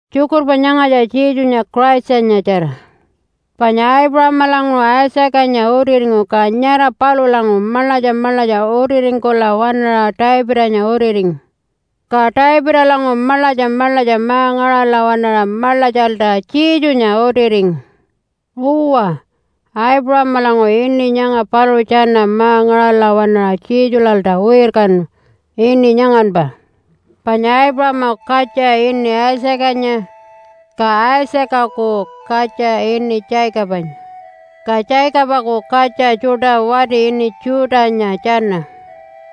Tjukurpa nyangatja Jesunya Christanyatjara. Panya Aipuṟamalanguṟu Isaacanya utiringu ka nyara palulanguṟu maḻatja maḻatja utiringkula waṉaṟa Davidanya utiringu. Ka Davidalanguṟu maḻatja maḻatja ma-ngaṟala waṉaṟa maḻatjalta Jesunya utiringu. Uwa, Aipuṟamalanguṟu ini nyanga paluṟu tjana ma-ngaṟala waṉaṟa Jesulalta wirkanu, ini nyanganpa Panya Aipuṟamaku katja ini Isaacanya, ka Isaacaku katja ini Jacobanya, ka Jacobaku katja tjuṯa wati ini Judah-nya tjana.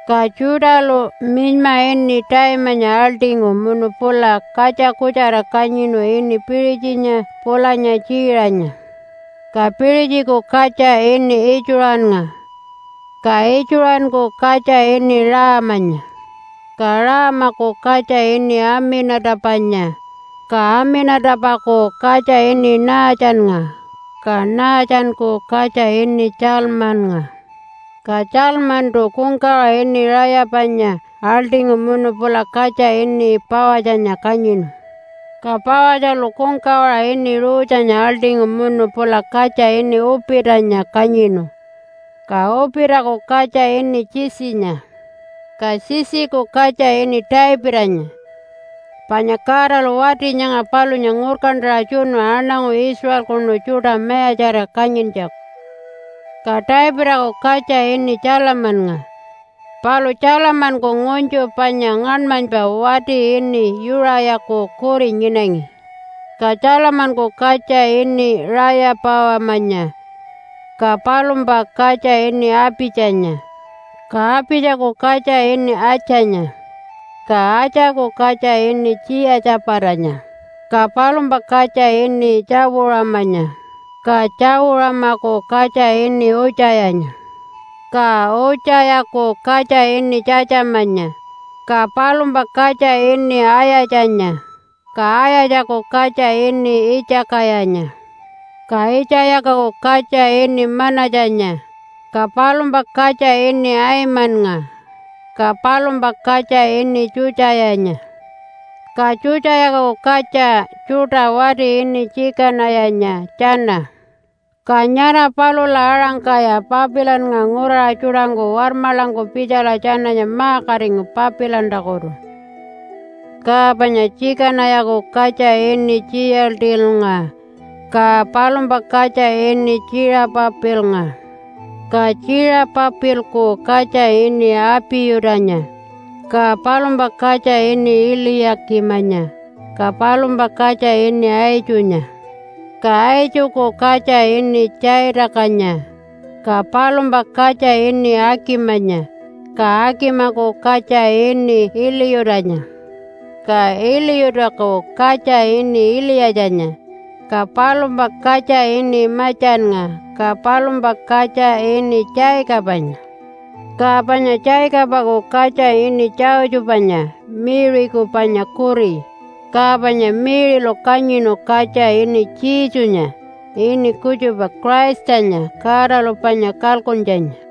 Ka Judah-lu minyma ini Taimanya aḻṯingu munu pula katja kutjara kanyinu ini Piṟitjinya pulanya Tjiṟanya. Ka Piṟitjiku katja ini Itjuṟannga, ka Itjuṟanku katja ini Raamanya. Ka Raamaku katja ini Amina-tapanya, ka Amina-tapaku katja ini Naatjannga, ka Naatjanku katja ini Tjalmannga. Ka Tjalmantu kungkawaṟa ini Rayapanya aḻṯingu munu pula katja ini Pawatjanya kanyinu, ka Pawatjalu kungkawaṟa ini Ruthanya aḻṯingu munu pula katja ini Uupitanya kanyinu. Ka Uupitaku katja ini Jesse-nya. Ka Jesse-ku katja ini Davidanya, panya Godalu wati nyanga palunya ngurkantaṟa tjunu aṉangu Israelkunu tjuṯa mayatjarira kanyintjaku. Ka Davidaku katja ini Tjalamannga. Palu Tjalamanku ngunytju panya ngaṉmanypa wati ini Yuṟayaku kuri nyinangi. Ka Tjalamanku katja ini Raya-pawamanya, ka palumpa katja ini Apitjanya. Ka Apitjaku katja ini Atjanya, Ka Atjaku katja ini Tjiya-tjapatanya, ka palumpa katja ini Tjawu-ṟamanya, ka Tjawu-ṟamaku katja ini Utjayanya. Ka Utjayaku katja ini Tjatjamanya, ka palumpa katja ini Ayatjanya, ka Ayatjaku katja ini Itjakayanya. Ka Itjakayaku katja ini Manatjanya, ka palumpa katja ini Aimannga, ka palumpa katja ini Tjutjayanya. Ka Tjutjayaku katja tjuṯa wati ini Tjikanayanya tjana. Ka nyara palula aṟangkaya Papilannga nguraṟa tjuṯangku warmaḻangku pitjala tjananya ma-katingu Papilantakutu. Ka panya Tjikanayaku katja ini Tjiyaltilnga, ka palumpa katja ini Tjiṟapapilnga. Ka Tjiṟapapilku katja ini Apiyutanya, ka palumpa katja ini Iliya-kimanya, ka palumpa katja ini Aitjunya. Ka Aitjuku katja ini Tjaitakanya, ka palumpa katja ini Akimanya, ka Akimaku katja ini Iliyutanya. Ka Iliyutaku katja ini Iliyatjanya, ka palumpa katja ini Matjannga, ka palumpa katja ini Jacobanya. Ka panya Jacobaku katja ini Josephanya Mary-ku panya kuri, ka panya Mary-lu kanyinu katja ini Jesunya ini kutjupa Christanya Godalu panya kalkuntjanya.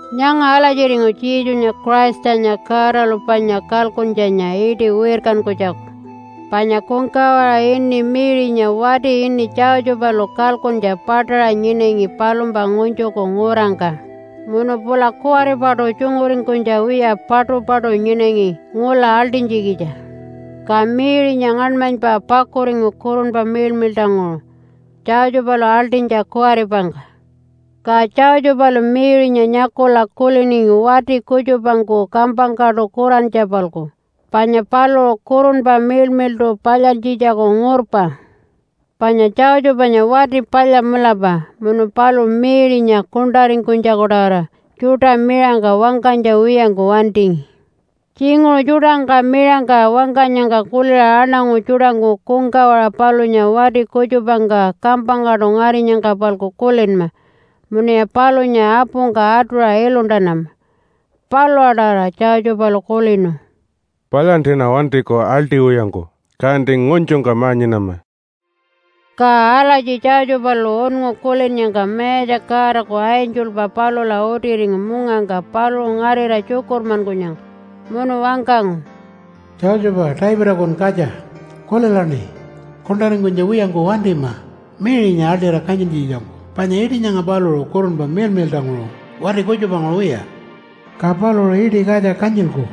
Nyanga alatjiringu Jesunya Christanya Godalu panya kalkuntjanya iṯi wirkankunytjaku. Panya kungkawaṟa ini Mary-nya wati ini Josephalu kalkuntja paṯaṟa nyinangi palumpa ngunytjuku ngurangka munu pula kuwaripaṯu tjunguringkunytja wiya paṯupaṯu nyinangi ngula aḻṯinytjikitja. Ka Mary-nya ngaṉmanypa pakuringu Kurunpa Miḻmiḻṯanguṟu, Josephalu aḻṯinytja kuwaripangka. Ka Josephalu Mary-nya nyakula kuliningi wati kutjupangku kampangkaṯu kurantja-palku panya paluṟu Kurunpa Miḻmiḻṯu palyantjitjaku ngurpa. Panya Josephanya wati palya mulapa munu paluṟu Mary-nya kuṉṯaringkunytjaku-tawara tjuṯa miṟangka wangkanytja wiyangku wantingi. Tjinguṟu tjuṯangka miṟangka wangkanyangka kuliṟa aṉangu tjuṯangku kungkawaṟa palunya wati kutjupangka kampangkaṯu ngarinyangka-palku kulinma munuya palunya apungka atuṟa iluntanama. Palula-tawara Josephalu kulinu, “Palyantiṉa wantiku aḻṯiwiyangku, kanti ngunytjungka ma-nyinama.” Ka alatji Josephalu unngu kulinnyangka Mayatja Godaku angelpa palula utiringu mungangka paluṟu ngarira tjukurmankunyangka, munu wangkangu, “Josepha, Davidakun katja, kulilaṉi! Kuṉṯaringkunytja wiyangku wantima Mary-nya aḻṯira kanyintjikitjangku panya iṯi nyanga paluṟu Kurunpa Miḻmiḻṯanguṟu, wati kutjupanguṟu wiya. Ka paluṟu iṯi katja kanyilku,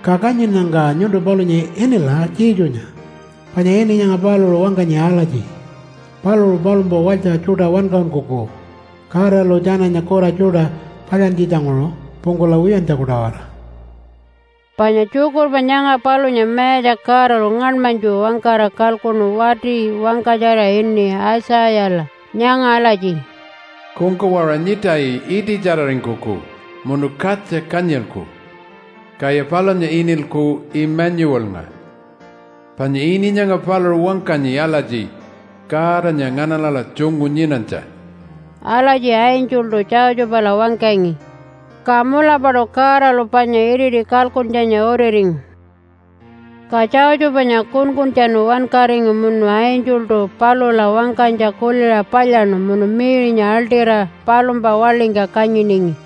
ka kanyinnyangka nyuntu palunya inila Jesunya panya ini nyanga paluṟu wangkanyi alatji, ‘Paluṟu palumpa walytja tjuṯa wankaṟunkuku Godalu tjananya kura tjuṯa palyantjitjanguṟu pungkula wiyantjaku-tawara.’” Panya tjukurpa nyanga palunya Mayatja Godalu ngaṉmanytju wangkara kalkuṉu wati wangkatjara ini Aitjayala nyanga alatji, “Kungkawaṟa nyiṯayi iṯitjararingkuku munu katja kanyilku, kaya palunya inilku ‘Imanyuwalnga’, panya ini nyanga paluṟu wangkanyi alatji, ‘Godanya nganaṉala tjungu nyinanytja.’” Alatji angeltu Josephala wangkangi. Ka mulapaṯu Godalu panya iriti kalkuntjanya utiringu. Ka Josephanya kunkuntjanu wankaringu munu angeltu palula wangkanytja kuliṟa palyaṉu munu Mary-nya aḻṯira palumpa waḻingka kanyiningi.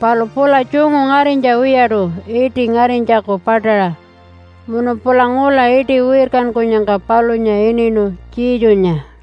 Palu pula tjungu ngarinytja wiyaṯu iṯi ngarinytjaku paṯaṟa. Munu pula ngula iṯi wirkankunyangka palunya ininu Jesunya.